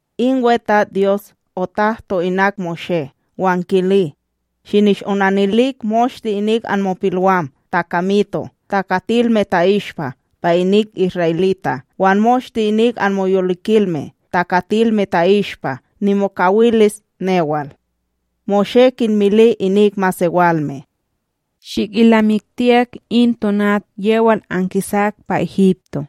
In WeTatsDyos otahto inak Moshé wan kili: “Shinishonanilik moshte inik anmopilwam takamito' takatilme ta'ishpa pa inik isra'elita' wan moshte inik anmoyolikilme takatilme ta'ishpa nimokawilis newal.” Moshé kinmili inik masewalme: “Shikilnamiktiyak in tonat yewal ankisak pa Egipto,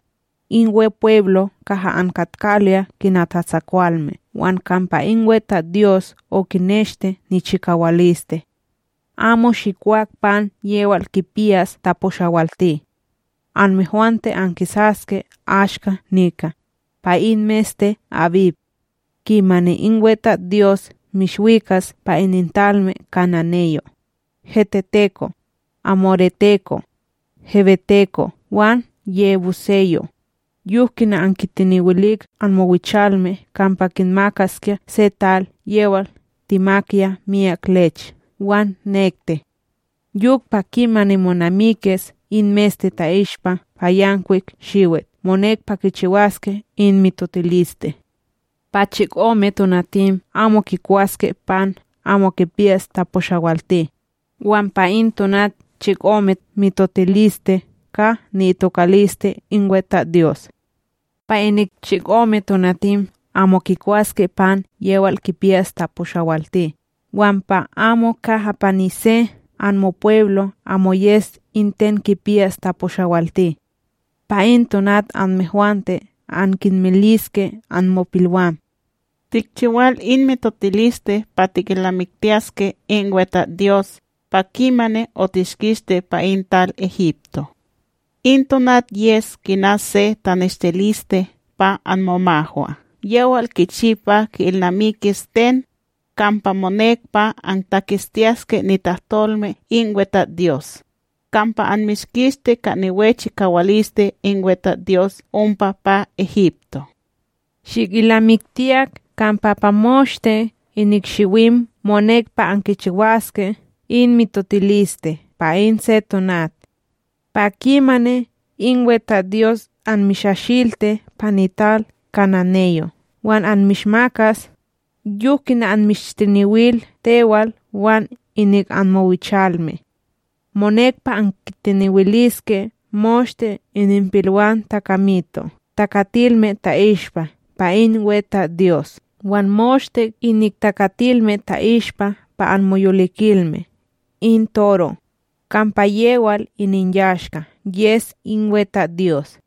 in Wepweblo kaha ankatkaloya kina tatsakwalme wan kampa in WeTatsDyos okineshti nichikawaliste. Amo shikwak pan yewal kipiyas taposhawalti. Anmehwante ankisaske ashka nika, pa in meste abib, kimani in WeTatsDyos mishwikas pa inintalme kananeyo', heteteko', amoreteko', heweteko' wan yebuseyo', yok kina okintenewil anmowichalme kampa kinmakaskya se tal yewal timak miyak lech wan nekti! Yok pa kimani monamikis in meste ta'ishpa pa yankwik shiwit monek pa kichiwaske in mitotiliste. Pa chikome tonatim amo kikwaske pan amo kipiyas taposhawalti, wan pa in tonat chikome monek pa kichiwaske mitotiliste ka ni'itokaliste in WeTatsDyos. Pa inik chikome tonatim amo kikwaske pan yewal kipiyas taposhawalti wan pa amo kaha pa ni se anmopweblo' amo yes in ten kipiyas taposhawalti. ’Pa in tonat anmehwante ankinmiliske anmopilwam: ‘Tikchiwal in mitotiliste pa tikilnamiktiyaske in WeTatsDyos pa kimani otishkisti pa in tal Egipto.’ In tonat yes kina se taneshtiliste pa momahwa wan pa mofrente yewal kichi pa ki'ilnamikis ten, kampa monek pa antaketstiyaske nitahtolme in WeTatsDyos, kampa anmishkistis ka niwe chikawaliste in WeTatsDyos ompa pa Egipto. Shikilnamiktiyak kampa pa moshte inik shiwim monek pa ankichiwaske in mitotiliste pa in se tonat. ’Pa kimani in WeTatsDyos anmishashilti pa nital kananeyo' wan anmishmakas, yok kina anmishtenewil tewal wan inik anmowichalme. Monek pa ankintenewiliske moshte ininpilwam takamito' takatilme ta'ishpa pa in WeTatsDyos wan moshte inik takatilme ta'ishpa pa anmoyolikilme in toro, kampa yewal ininyashka yes in WeTatsDyos.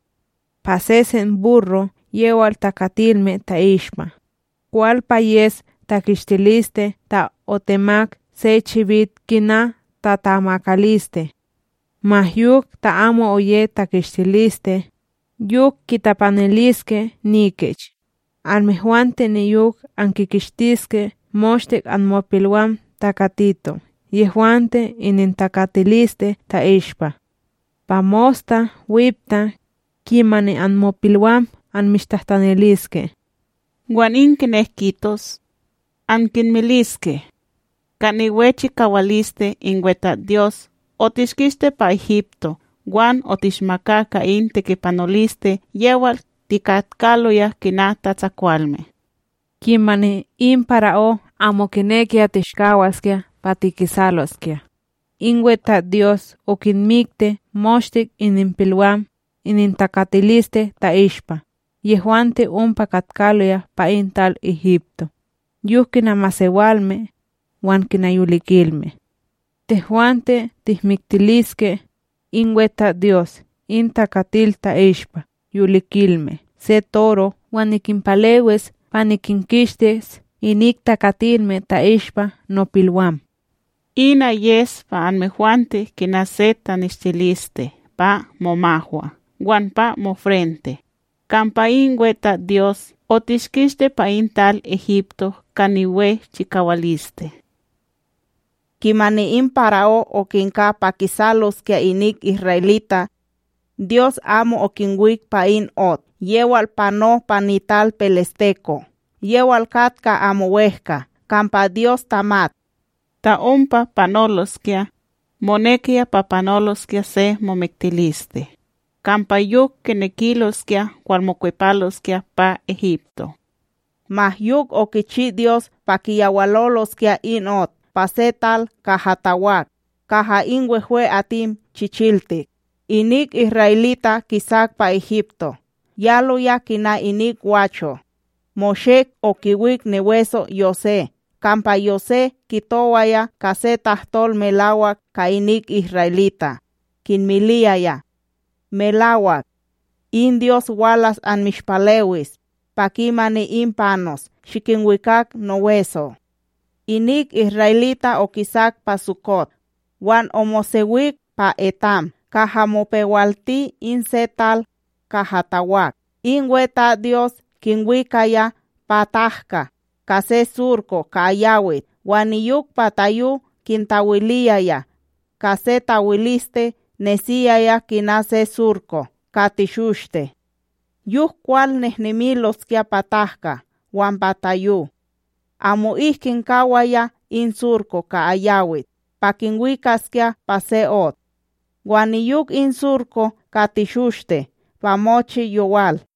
Pa sesen burro yewal takatilme ta'ishpa, kwal pa yes takistiliste ta otemak se chibit kina tatamakaliste. Ma yok ta amo oye takistiliste, yok kitapaniliske nikich. Anmehwante niyok ankinkistiske moshte anmopilwam takatito' yehwante inintakatiliste ta'ishpa. ’Pa mosta wipta, kimani anmopilwam anmishtahtaniliske: “Wan in ten kinek kitos? ankinmiliske: ‘Ka niwe chikawaliste in WeTatsDyos otishkisti pa Egipto wan otishmaka ka in tekipanoliste yewal tikatkaloya kina tatsakwalme.’ Kimani in para'ó amo kinekiya tishkawaskya pa tikisaloskya, in WeTatsDyos okinmikti moshte ininpilwam inintakatiliste ta'ishpa yehwante ompa katkaloya pa in tal Egipto, yok kina masewalme, wan kina yolikilme. Tehwante tihmiktiliske in WeTatsDyos in takatil ta'ishpa yolikilme se toro wan nikinpalewis pa nikinkistis inik takatilme ta'ishpa nopilwam.” Ina yes pa anmehwante kina se taneshtiliste pa momahwa wan pa mofrente, kampa in WeTatsDyos otishkisti pa in tal Egipto ka niwe chikawaliste.’” Kimani in para'ó okinka pa kisaloskya inik isra'elita', Dyos amo okinwik pa in ot yewal pano pa nital peleshteko' yewal katka amo wehkA, kampa Dyos tamat: “Ta ompa panoloskya, monekiya pa panoloskya se momiktiliste, kampa yok kinekiloskya walmokwepaloskya pa Egipto.” Ma yok okichi Dyos pa kiyawaloloskya in ot pa se tal kaha tawak, kaha in wehwe'atim chichiltik. Inik isra'elita' kisak pa Egipto yaloya kina inik gwacho. Moshé okiwik niweso' Yosé, kampa Yosé kitowaya ka se tahtol melawak ka inik isra'elita' kinmiliyaya: “Melawak, in Dyos walas anmishpalewis pa kimani in panos shikinwikak noweso'.” Inik isra'elita' okisak pa Sukot wan omosewik pa Etam kaha mopewalti in se tal kaha tawak In WeTatsDyos kinwikaya pa tahka ka se surko ka ayawit wan niyok pa tayo kintawiliyaya ka se tawiliste nesiyaya kina se surko ka teshoshte. Yok kwal nehnemiloskya pa tahka wan pa tayo. Amo'ik kinkawaya in surko ka ayawit pa kinwikaskya pa se ot, wan niyok in surko ka teshoshte pa mochi yowal.